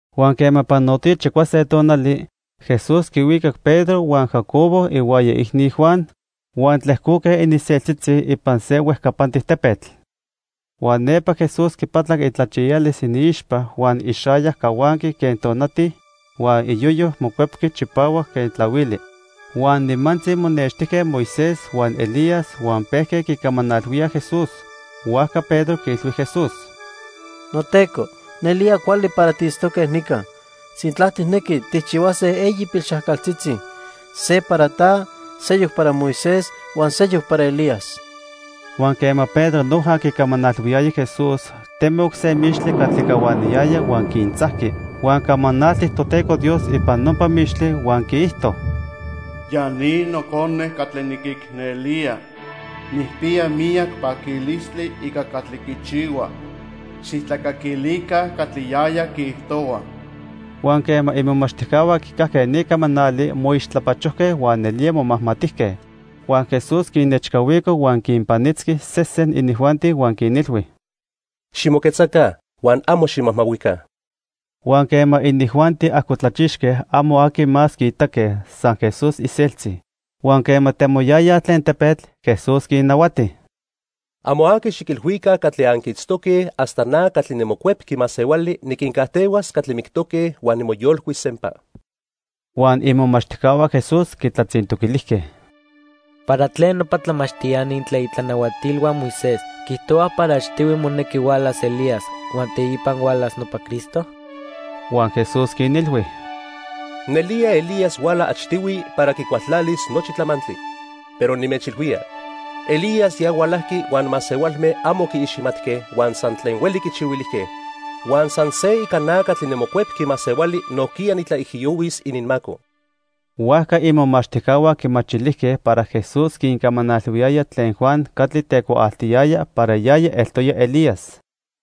Huan quema panotoya chicuase tonali, Jesús quihuicac Pedro huan Jacobo ihuaya iicni, Juan, huan tlejcoque ininseltzitzi ipan se huejcapantic tepetl. Huan nepa Jesús quipatlac itlachiyalis iniixpa huan ixayac cahuanqui quen tonati huan iyoyo mocuepqui chipahuac quen tlahuili. Huan nimantzi monextijque Moisés huan Elías huan pejque quicamanalhuíaj Jesús. Huajca Pedro quiilhui Jesús: —NoTeco, nelía cuali para tiitztoque nica. Sintla tijnequi, tijchihuase eyi pilxajcaltzitzi. Se para ta, seyoc para Moisés huan seyoc para Elías. Huan quema Pedro noja quicamanalhuiyaya Jesús, temoc se mixtli catli cahuaniyaya huan quintzajqui. Huan camanaltic Toteco Dios ipan nopa mixtli huan quiijto: "Ya ni Nocone catli niquicnelía. Nijpiya miyac paquilistli ica catli quichihua. Xijtlacaquilica catli yaya quiijtohua." Huan quema imomachtijcahua quicajque ni camanali, moixtlapachojque huan nelía momajmatijque. Huan Jesús quinnechcahuico huan quinpanitzqui sesen inijuanti huan quinilhui: —Ximoquetzaca huan amo ximajmahuica. Huan quema inijuanti ajcotlachixque, amo aqui más quiitaque, san Jesús iseltzi. Huan quema temoyayaj tlen tepetl, Jesús quinnahuati: —Amo aqui xiquilhuica catli anquiitztoque hasta na catli niMocuepqui Masehuali niquincajtehuas catli mictoque huan nimoyolcuis sempa. Huan imomachtijcahua Jesús quitlatzintoquilijque: —¿Para tlen nopa tlamachtiani tlen itlanahuatilhua Moisés quiijtohuaj para achtihui monequi hualas Elías huan teipa hualas nopa Cristo? Huan Jesús quinilhui: —Nelía Elías huala achtihui para quicualtlalis nochi tlamantli. Pero nimechilhuía, Elías ya hualajqui huan masehualme amo quiiximatque huan san tlen hueli quichihuilijque. Huan san se ica na catli niMocuepqui Masehuali nojquiya nitlaijiyohuis ininmaco. Huajca imomachtijcahua quimachilijque para Jesús quincamanalhuiyaya tlen Juan catli tecuaaltiyaya para yaya eltoya Elías.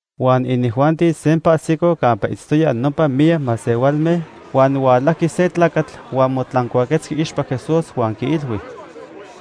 Huan inijuanti sempa ajsicoj campa itztoyaj nopa miyac masehualme, huan hualajqui se tlacatl huan motlancuaquetzqui iixpa Jesús huan quiilhui: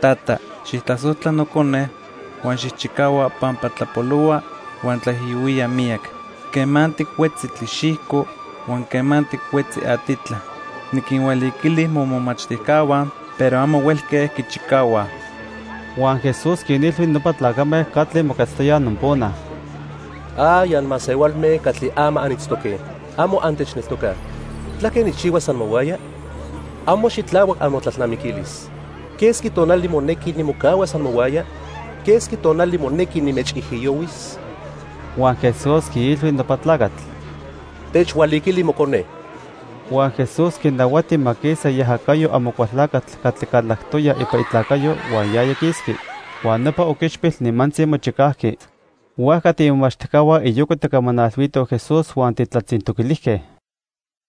—Tata, xijtlasojtla nocone huan xijchicahua pampa tlapolohua huan tlaijiyohuía miyac. Quemantic huetzi tlixijco huan quemantic huetzi atitla. Niquinhualiquili momomachtijcahua pero amo huelque quichicahuaj. Huan Jesús quinilhui nopa tlacame catli moquetztoyaj nopona: —¡Ay anmasehualme catli ama anitztoque, amo antechneltocaj! ¿Tlaque nijchihuas amohuaya? Amo xitlahuac amotlalnamiquilis. ¿Quesqui tonali monequi nimocahuas amohuaya? ¿Quesqui tonali monequi nimechijiyohuis? Huan Jesús quiilhui nopa tlacatl: —Techhualiquili mocone. Huan Jesús quinahuati ma quisa iajacayo Amocualtlacatl catli calactoya ipan itlacayo, huan yaya quisqui. Huan nopa oquichpil nimantzi mochicajqui. Huajca tiimomachtijcahua iyoca tijcamanalhuitoj Jesús huan tijtlatzintoquilijque: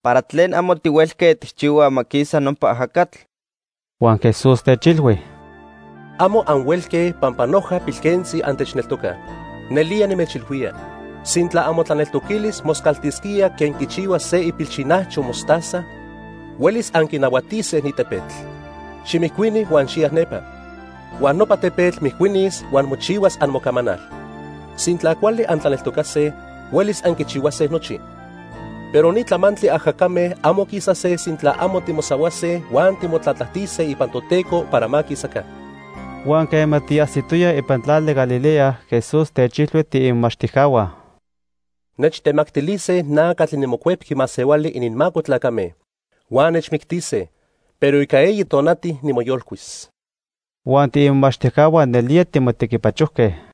—¿Para tlen amo tihuelque tijchihuaj ma quisa nopa ajacatl? Huan Jesús techilhui: —Amo anhuelque pampa noja pilquentzi antechneltocaj. Nelía nimechilhuía, sintla amotlaneltoquilis moscaltisquía quen quichihua se ipilxinajcho mostaza, huelis anquinahuatise ni tepetl: 'Ximijcuini huan xiya nepa'. Huan nopa tepetl mijcuinis huan mochihuas amocamanal. Sintla cuali antlaneltocase, huelis anquichihuase nochi. Pero ni tlamantli ajacame amo quisase sintla amo timosahuase huan timotlatlajtise ipan Toteco para ma quisaca. Huan quema tiajsitoyaj ipan tlali Galilea, Jesús techilhui tiimomachtijcahua: —Nechtemactilise na catli niMocuepqui Masehuali ininmaco tlacame, huan nechmictise, pero ica eyi tonati nimoyolcuis. Huan tiimomachtijcahua nelía timotequipachojque.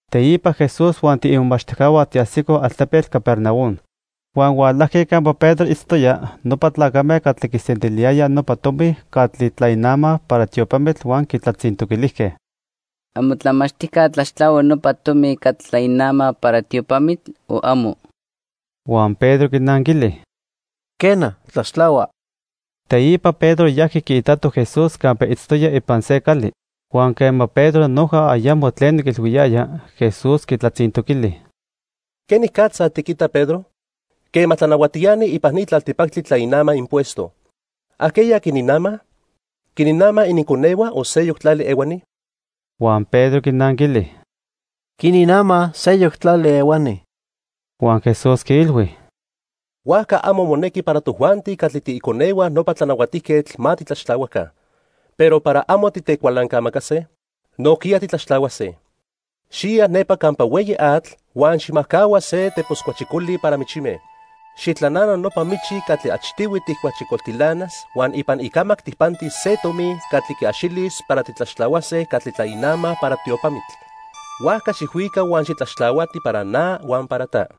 Teipa Jesús huan tiimomachtijcahua tiajsicoj altepetl Capernaum. Huan hualajque campa Pedro itztoya nopa tlacame catli quisentiliyayaj nopa tomi catli tlainamaj para tiopamitl huan quitlatzintoquilijque: —¿Amotlamachtijca tlaxtlahua nopa tomi catli tlainamaj para tiopamitl o amo? Huan Pedro quinanquili: —Quena, tlaxtlahua. Teipa Pedro yajqui quiitato Jesús campa itztoya ipan se cali. Huan quema Pedro noja ayamo tleno quiilhuiyaya, Jesús quitlatzintoquili: —¿Quenicatza tiquita, Pedro? Quema tlanahuatiani ipan ni tlaltipactli tlainamaj impuesto, ¿ajqueya quininamaj? ¿Quininamaj ininconehua o seyoc tlali ehuani? Huan Pedro quinanquili: —Quininamaj seyoc tlali ehuani. Huan Jesús quiilhui: —Huajca amo monequi para tojuanti catli tiiconehua nopa tlanahuatijquetl ma titlaxtlahuaca. Pero para amo titecualancamacase, nojquiya titlaxtlahuase. Xiya nepa campa hueyi atl huan xijmajcahua se tepos cuachijcoli para michime. Xijtlanana nopa michi catli achtihui tijcuachijcoltilanas, huan ipan icamac tijpantis se tomi catli quiaxilis para titlaxtlahuase catli tlainamaj para tiopamitl. Huajca xijhuica huan xitlaxtlahuati para na huan para ta.